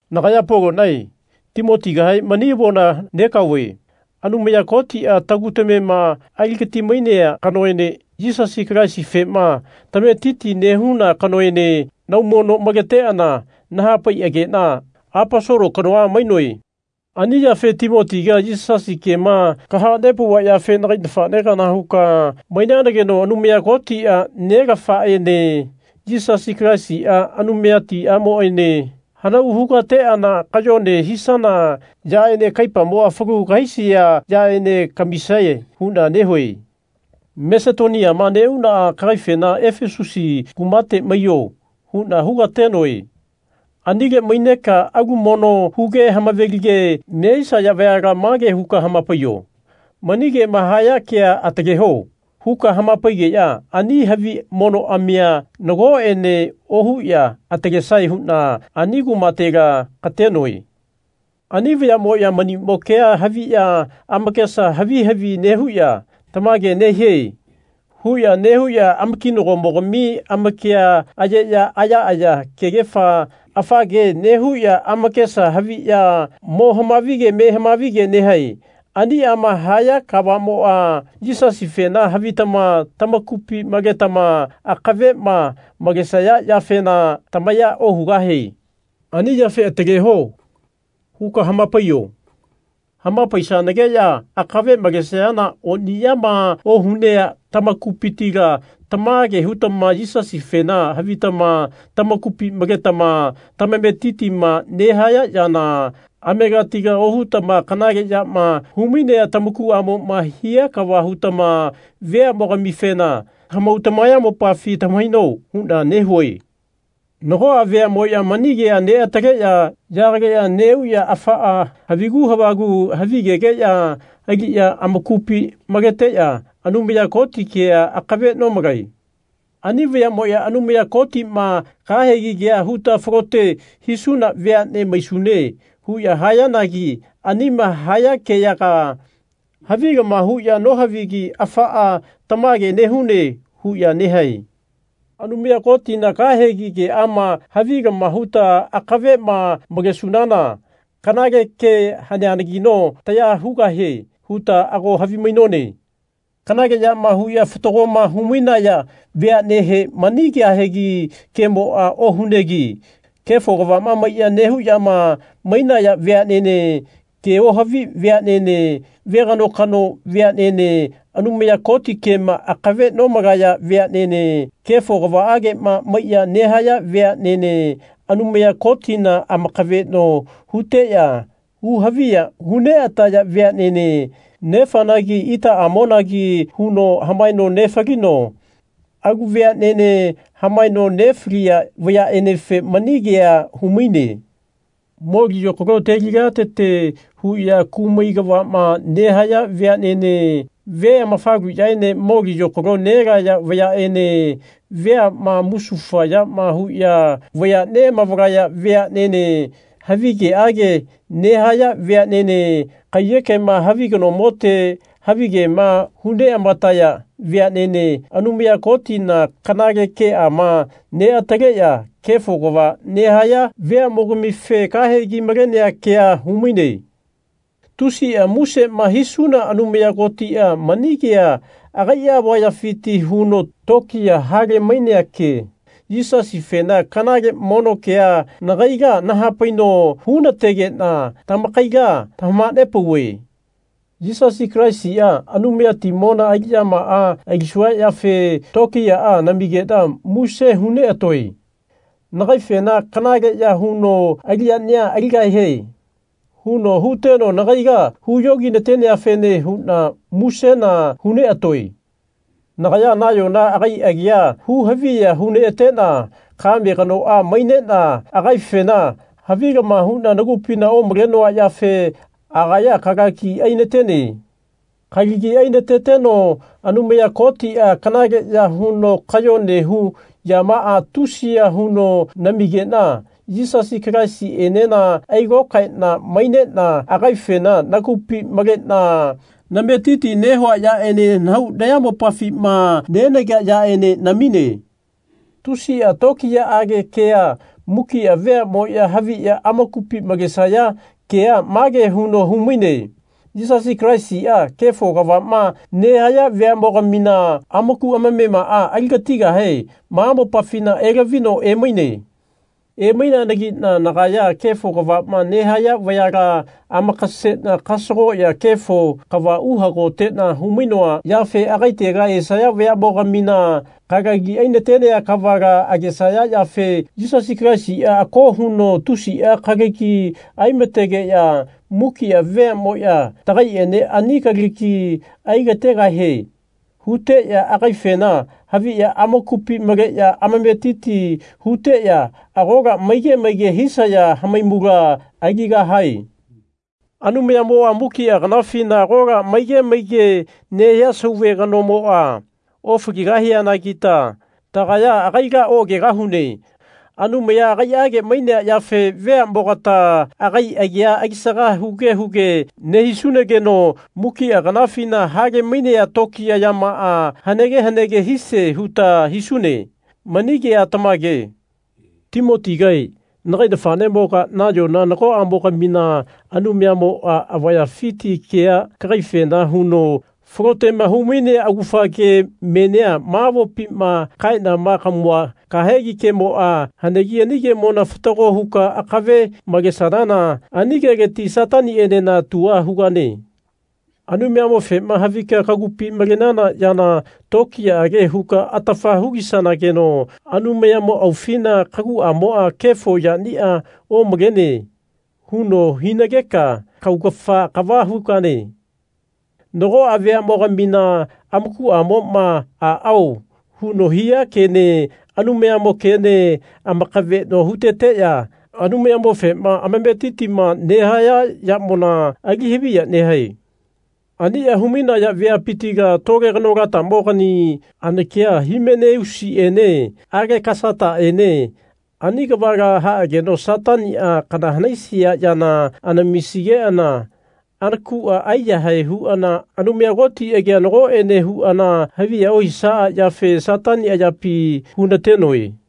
Nagaya Polonae Timotigahe mani avona negaove. Anumaya Kotia tagu tamema aligati-mainea kanoene Yisasi Kalaisifema tametiti nehuna kanoene naumono maleteana nahapaiagena Aposolo kanoa mainoe. Ani yafe Timotiga Yisasi kema kahanepauva yafe nagai nafane kana huka mainanageno Anumaya Kotia, Nelaafaene Yisasi Kalaisia, Anumayatiamoene hanau hugateana kayone hisana yaene kaipamoa falu kahaisia yaene kamisae huna nehue. Masetoniama neuna kagaifena Efasusi kumate maiyo. huna hugatenoe. Anile maineka alu mono huge amave-lige nehisaya vayala mage huka hamapaiyo Mani kema haya kea ataleho. huka hamapaigeya ani havi monoamia nagoene ohuya atalesae huna ani kumatela katenoe. Ani vayamoya manimo kea haviya amakesa havi havi nehuya Tamage nehie. huya nehuya amakinagomogami amakia ayeya ayaaya kegefa afa ke nehuya amakesa haviya mo hamavige me hamavige nehae. Aniama haya kavamoa Yisasifena havitama tamakupi maletama akavema malesaya yafena tamaya ohugahie. Ani yafe Ataleho. huka hamapaiyo. Hamapaisanageya akave malesayana oniyama ohunea tamakupitila tamage hutama Yisasifena havitama tamakupi maletama tamametitima nehaya yana amegatila ohutama kanale yama humainea tamakuamoma hia kava hutama veamogamifena tamahau tamayamopafi tamahaino huna nehue. Nagoa veamoya mani kea neataleya yagaleya neuya afaa havigu havagu havigeyaga aliya amakupi maleteya Anumaya Koti kea akave nomalae. Ani vayamoya Anumaya Kotima kahegi kea huta falote hisuna veane maisune. huya hayanagi anima haya keyaga havilama huya nohavigi afaa Tamage nehune. huya nehae. Anumaya Kotina kahegi keama havilama huta akavema malesunana kanale ke haneanagino taya hugahie huta ago havimainone. Kanale yama huya fatagoma humainaya veanehe mani kahegi kemoa ohunegi kefo kavama maiya nehuyama mainaya veanene, ke ohavi veanene, veganokano veanene, Anumaya Koti kema akave nomalaya veanene, kefo kavaagema maiya nehaya veanene, Anumaya Kotina amakaveno huteya hu haviya hu neataya veanene, nefanagi itaamonagi huno hamaeno nefalino, alu veanene hamaeno nefalia vayaenefe mani kea humaine. Moli yokalo teliliatete huya kumai kavama nehaya veanene, ve amafaluyaene moli yokalo nelaya vayaene, veama musufa yama huya vaya neamavalaya veanene, havigeage nehaya veanene, kaiyekema havi kanomote havigema hu neamataya veanene, Anumaya Kotina kanale keama neataleya kefo kava nehaya veamogamife kahegi malenea kea humaine. Tusia musema hisuna Anumaya Kotia mani kea agaia avayafiti huno tokiya hale-mainea ke, Yisasifena kanale mono kea, nagaila nahapaino hunategena tamakaila tamahanepauve. Yisasi Kalaisia, Anumayatimona aliyamaa alisua yafe tokiyaa namigena muse hu neatoe. Nagaifena Kanaleya huno aliyania aligahie. huno huteno nagaila huyoginateneafene huna musena huneatoe. Nagaya nayona agai agia hu haviya huneatena kame kanoa mainena agaifena havilama huna nagupina omalenoa yafe agaya kalagi ainatene. Kalagi ainateteno Anumaya Kotia kanaleya huno kayone hu yamaa tusiya huno namigena Yisasi Kalaisienena ailokaena mainena agaifena nagupi malena nametiti nehua yaene nahau nayamopafima nenagea yaene namine. Tusia tokiyaage kea, mukia veamoya haviya amakupi malesaya kea mage huno humaine Yisasi Kalaisia kefo kavama nehaya veamogamina amaku amamemaa aligatigahe ma mopafina elavino emaine. Emaineanagina nagaya kefo kavama nehaya vayala amakasena kasagoya kefo kava uhagotena humainoa yafe agaitega esaya vayamogamina kalagi ainatenea kavala agesaya yafe Yisasi Kalaisia ako huno tusia kalagi anategeya mukia veamoya Tagaiene ani kalagi ailategahie. huteya agaifena haviya amakupi maleya amametiti huteya agola maige maige hisaya hamaimula aligahae. Anumayamoa mukia kanafina agola maige maige nehia Sauve Kanomoa ofaligahianagita tagaya agaila oagegahune. Anumaya agaiage mainea yafe veamogata agai agia alisaga huge huge nehisunageno mukia kanafina hale-mainea tokiya yamaa hanege hanege hisie huta hisune. Mani kea tamage. Timotigae, nagai nafanemoga, nayona nagoamogamina Anumayamoa avayafiti kea kagaifena huno falotema humainea augafa ke menia ma avopima kaenama kamua kahegi kemoa hanegi ani kemona fatago huka akave malesanana ani keleti Satanienena tua hugane. Anumayamofema havika kagupi malenana yana tokiyaage huka atafa hulisanageno Anumayamo aufina kaguamoa Kefo yania omalene. huno hinageka kaugafa kava hugane. Nagoa veamogamina amakuamoma Aao. huno hia kene Anumayamo kene amakaveno huteteya Anumayamofema amametitima nehaya yamona ali haviya nehae. Ania humainaya veapitila tole kanolatamogani anakia Himeneusiene Alekasataene ani kavala haageno Satania kana hanaisia yana anamisigeana anakua aiyahae huana Anumaya Koti agia nagoene huana haviya ohisaa yafe Satani ayapi hunatenoe.